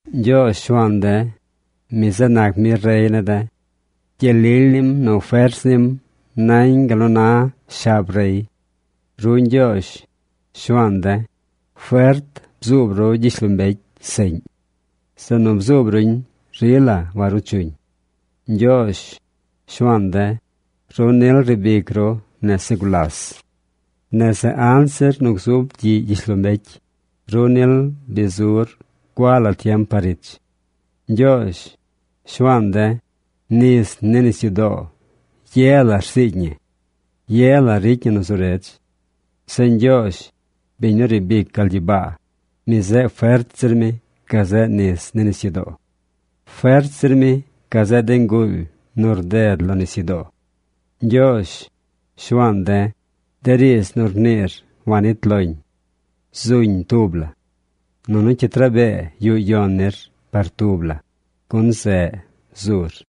Ñgyoozh, Shuaan de̱, mi zeꞌ nac mi rey ne̱ de̱. Gyel lily nim nu fers nim nañ gal nu na shab rey. Ru Ñgyoozh, Shuaan de̱, fert bzuub ru gyishlombecy seꞌñ. Zeꞌ nu bzuub ruñ rila waruu chuñ. Ñgyoozh, Shuaan de̱, ru nil riib ic ru nese gulas. Nese anzir nu gzub gyiꞌ gyishlombecy, ru nil bi zur gua la tiem par ich. Ñgyoozh, Shuaan de̱, nis ni nisyudoo ye la rziigy ñi. Ye la ricy ñi nu zu redz. Zeꞌ Ñgyoozh, biñ nu riib ic gal gyibaa, mi zeꞌ fert zir mi gazeꞌ nis ni nisyudoo. Fert zir mi gazeꞌ de nguuly nu rded lo nisyudoo. Ñgyoozh, Shuaan de̱, de riidz nu rniir wanit loñ. Zuñ tub la. Nunu cyit rabee yuꞌ yon nir par tub la, gun zeꞌ zur.